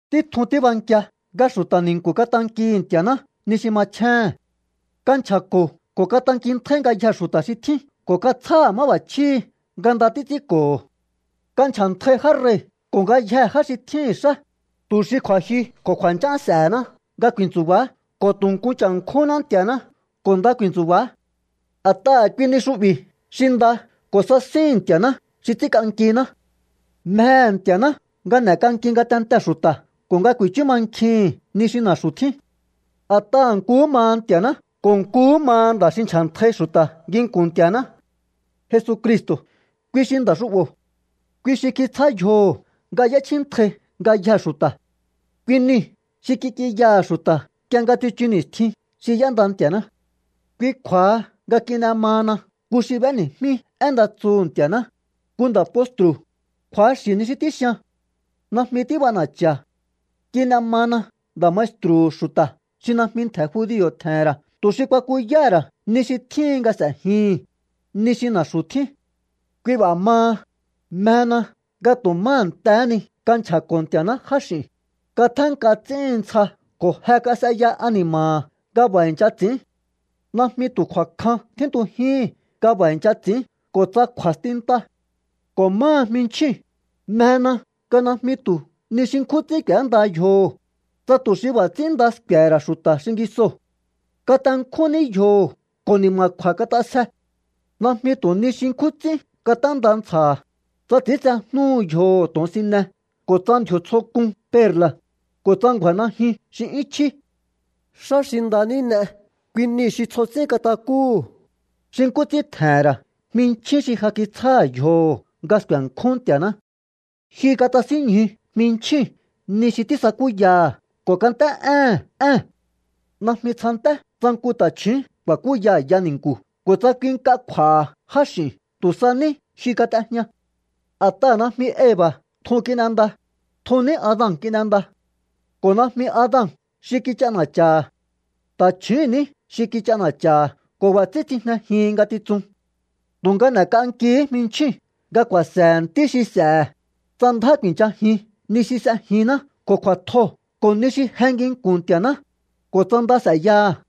Títjun tíbankia nga xu̱ta̱ ni̱nku̱ katankihi̱ Nti̱a̱ná ni xi machjéhe̱n. Kanchja̱ko̱ ko̱ katankintjáí ngayjee̱ xu̱ta̱ xi tjín ko̱ katsjáha̱ máb'a̱chjíhi̱ nga nda títs'ínko̱ho̱. Kanchja̱ntai já rei̱ ko̱ ngayjee̱ já xi tjíhi̱n xá, tu̱ xi kju̱a̱jyu ko̱ kju̱a̱nch'án s'e̱hená nga ku̱i̱ntsu̱ba̱á ko̱ tu̱ nku cha̱nkjúhúnná Nti̱a̱ná ko̱ nda ku̱i̱ntsu̱ba̱á. A̱t'aha̱ kui ni xu'bi̱ xi nda ko̱ sasíhi̱n Nti̱a̱ná xi ts'ínk'ankiná. Mjehe̱ Nti̱a̱ná nga n'e̱k'anki ngatentee̱ xu̱ta̱ ko̱ nga ku̱i̱chú mankjihi̱n ni xi na̱xu̱ tjín. A̱t'aha̱ nkuhú maha Nti̱a̱ná ko̱ nkuhú maha nda̱ xi nchja̱ntjai xu̱ta̱ nginku̱n Nti̱a̱ná. Jesucristo̱, kui xi nda̱ xu'bo̱. Kui xi kitsjá yjoho̱ nga y'échjíntjai ngayjee̱ xu̱ta̱. Kui niu̱ xi kik'inyaha̱ xu̱ta̱ nk'ie nga tsichu ni̱stjin xi y'énda Nti̱a̱ná. Kui kju̱a̱ha nga kin'e mahana nku xi b'éni̱jmí én nda tsuhu̱ Nti̱a̱ná, nku nda̱ postru̱. Kju̱axi̱ ni xi tíxian. Najmi tíb'ana̱cha̱. Kin'e mana nda̱ maestru̱hu̱ xu̱ta̱ xi najmi ntje̱ judio̱ tje̱he̱n ra̱ tu̱ xi kuakuyáha̱ ra̱ ni xi tjíhin nga s'e̱jihi̱n, ni xi na̱xu̱ tjín. Kui b'a̱ maha, mjena nga tu̱ má a̱ntehé ni kanchja̱ko̱ Nti̱a̱ná jáx'i̱u̱n, katjénk'ahá ts'íhin ntsja ko̱ je kas'eya ani̱ma̱ha̱ nga b'a̱ i̱ncha ts'i̱ín. Najmi tu̱ kju̱a̱kjan tjíntujíhi̱n nga b'a̱ i̱ncha ts'i̱ín ko̱ tsa kju̱a̱stinta. Ko̱ máha jminchjíu̱n, mjena nga najmi tu̱ ni xi nkjún ts'ín k'u̱énda yjoho̱, tsa tu̱ xi b'a̱ ts'ín nda sku̱e̱he̱ ra̱ xu̱ta̱ xingisoo̱. Katenkjún ní yjoho̱ ko̱ ni̱ma̱kju̱a̱ kat'asje. Najmi tu̱ nihi xi nkjún ts'ín kat'énda ntsja̱ha̱, tsa ts'i̱íntsejnúhu yjoho̱ to̱onsine ko̱ tsa ndji̱o̱ tsjo k'un perla̱, ko̱ tsa ngju̱a̱ najyun xi 'yún chjí. Xá xi nda ní n'e, kui niu̱ xi tsjo ts'ín katakúhu̱, xi nkú ts'ín tje̱he̱n ra̱ jminchjín xi ja kitsjáha̱ yjoho̱ nga sku̱e̱nkjún Nti̱a̱ná. Jyu katasínñju jminchjíu̱n ni xi tísakúyaha̱ ko̱ kant'é'éhe̱n ée̱n. Najmi tsjanté tsa nku ta̱chju̱ún ku̱a̱kúya a̱ya ni̱nku̱ ko̱ tsa kui nk'a kj'u̱a̱ha̱ jáx'i̱u̱n. Tu̱ sa ní jyu kat'ejña. A̱t'aha̱ najmi Eva̱ tjun kin'enda, tjun ní Adan kin'enda. Ko̱ najmi Adan xi kich'ana̱cha̱ha̱. Ta̱chjúu̱n ní xi kich'ana̱cha̱ha̱ ko̱ b'a̱ ts'ín tsijnejihin ngatitsun. Tu̱nga n'e̱k'ankihí jminchjíu̱n nga ku̱a̱se̱he̱ ntí xi s'e̱he̱, tsa ndjá ku̱i̱nchajin ni xi s'ejinná ko̱ kju̱a̱tjoo̱ ko̱ ni xi je nginku̱n Nti̱a̱ná, ko̱ tsa nda s'e̱yaha̱.